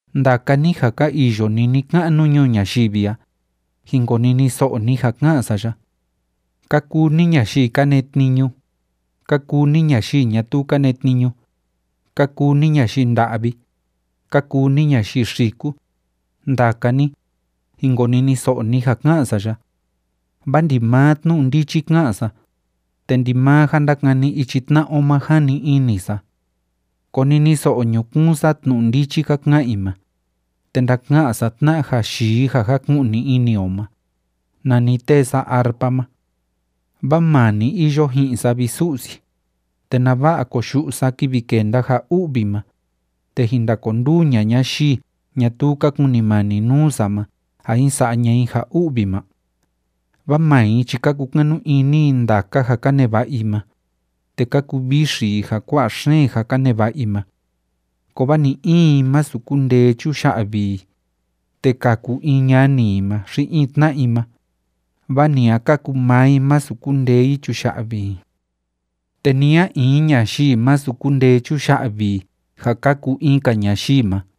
Ndaka ni ja ka iyo ni ni‑ka'nu ñuu ñayivi a, jin koniniso'o ni ja ka'an sa ya. Ka kuu ni ñayii ka netniñu, ka kuu ni ñayii ñatuu ka netniñu, ka kuu ni ñayii nda'vi, ka kuu ni ñayii xiku, ndaka ni, jin koniniso'o ni ja ká'an sa ya. Vaa ndimaa tnu'u ndichi ka'an sa, te ndimaa ja ndákani ichi tna'a o ma jani ini sa. Koniniso'o ñukuun sa tnu'u ndichi ka ka'an i ma, te ndaka'an sa tna'a ja yii ja jáku'ni ini o ma, nani tée sa arpa ma. Vaa maa ni iyo ji'in sa, vi Su'si, te ¿nava'a koyu'u sa kivi kenda ja u'vi ma, te jin ndakonduu ña'a ñayii ñatuu ka kunimani nuu sa ma ja jin sa'a ña'a i ja u'vi ma? Vaa maa i chi ka kukanu ini i ndaka ja ka neva'a i ma, te ka kuvixi i ja kua'a xeen ja ka neva'a i ma. Kovaa ni‑in i, masu kundee chuya'vi i, te kaku in ñani i ma xi in tna'a i ma, vaa ni a kaku maa i masu kundee i chuya'vi i. Te ni a in ñayii masu kundee chuya'vi i ja kaku in‑ka ñayii ma,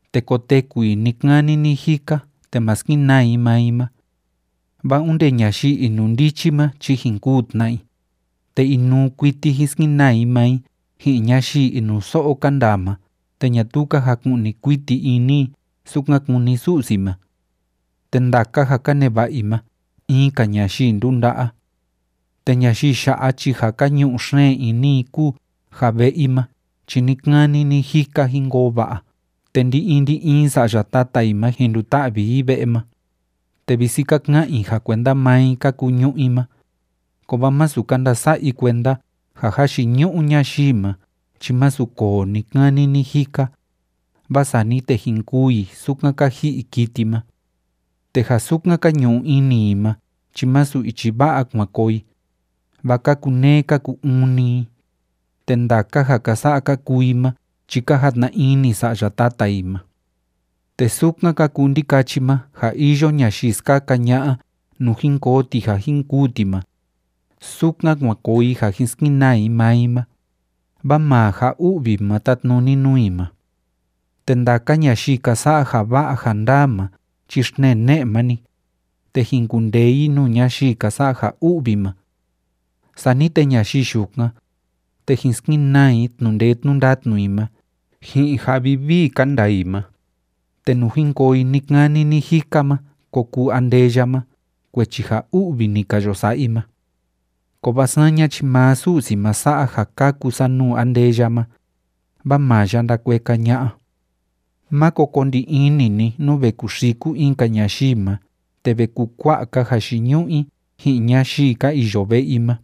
te koteku i ni‑kani ni‑jika te ma skenaa i maa i ma. Vaa onde ñayii inundichi ma chi jin kûu tna i, te inuu kuiti jin skenaa i maa i ji'in ñayii inuso'o ka ndaa ma te ñatuu ka jaku'ni kuiti ini i sukan kúni Su'si ma. Te ndaka ja ka neva'a i ma in‑ka ñayii ndunda'a. Te ñayii ya'a chi ja ka ñu'u xeen ini i kúu ja ve'e i ma chi ni‑kani ni‑jika jin koo va'a te ndi‑in ndi‑in sa'ya tata i ma jin nduta'vi i ve'e ma, te visi ka ka'an i ja kuenda maa i ka kuu ñu'ú i ma, kovaa masu ka ndasa'a i kuenda ja jayiñu'u ñayii ma chi másu koo ni‑kani ni‑jika, vaa sani te jin kûu i sukan ka ji'i kiti ma. Te ja sukan ka ñu'u ini i ma chi masu ichi va'a kuan koo i, vaa ka kuneé ka ku‑uun‑ni i, te ndaka ja ka sa'a ka kuu i ma chi ka jatna ini sa'ya tata i ma. Te sukan ka kuu ndikachi ma ja iyo ñayii skaka ña'a nuu jin koo ti ja jin kûu ti ma, sukan kuan koo i ja jin skenaa i maa i ma, vaa maa ja u'vi ma tátnuni nuu i ma. Te ndaka ñayii ka sa'a ja va'a ja ndaa ma chi xtnee ne'e ma‑ni, te jin kundee i nuu ñayii ka sa'a ja u'vi ma. Sani te ñayii yukan, te jin skenaa i tnu'u ndee tnu'u ndatnu i ma ji'in ja vivii ka ndaa i ma, te nuu jin koo i ni‑kani ni‑jika ma ko kuu andeya ma kuechi ja u'vi ni ka yo sa'a i ma. Kovaa saña chi maa Su'si ma sa'a ja kaku sa nuu andeya ma, vaa maa ya ndakueka ña'a. Máko ko ndi ini ni nú ve kuxiku in‑ka ñayii ma te ve kukua'a‑ka jayiñu'u i ji'in ñayii ka iyo ve'e i ma.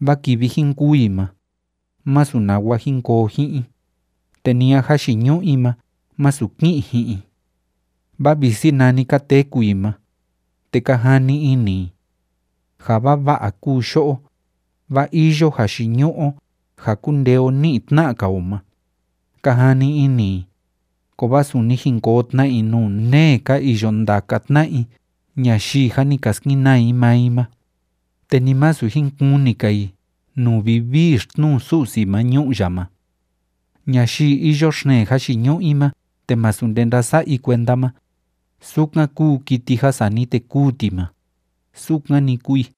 Vaa kivi jin kûu i ma, másu nawa jin koo ji'in i, te ni a jayiñu'u i ma másu ki'in ji'in i. Vaa visi nani ka téku i ma, te ka jani ini i: “Ja vava'a kúu yo'o, vaa iyo jayiñu'u o ja kúndee o ní'i tna'a‑ka o ma”, ka jani ini i, kovaa suni jin koo tna i nuu nee ka iyo ndaka tna'a i ñayii jâ ni ka skenaa i maa i ma, te ni masu jin kuni‑ka i nuu vivii xtnuu Su'si ma ñu'u ya ma. Ñayii iyo xeen jayiñu'u i ma te másu nde ndása'a i kuenda ma, sukan kúu kiti ja sani te kûu ti ma, sukan‑ni kúu i.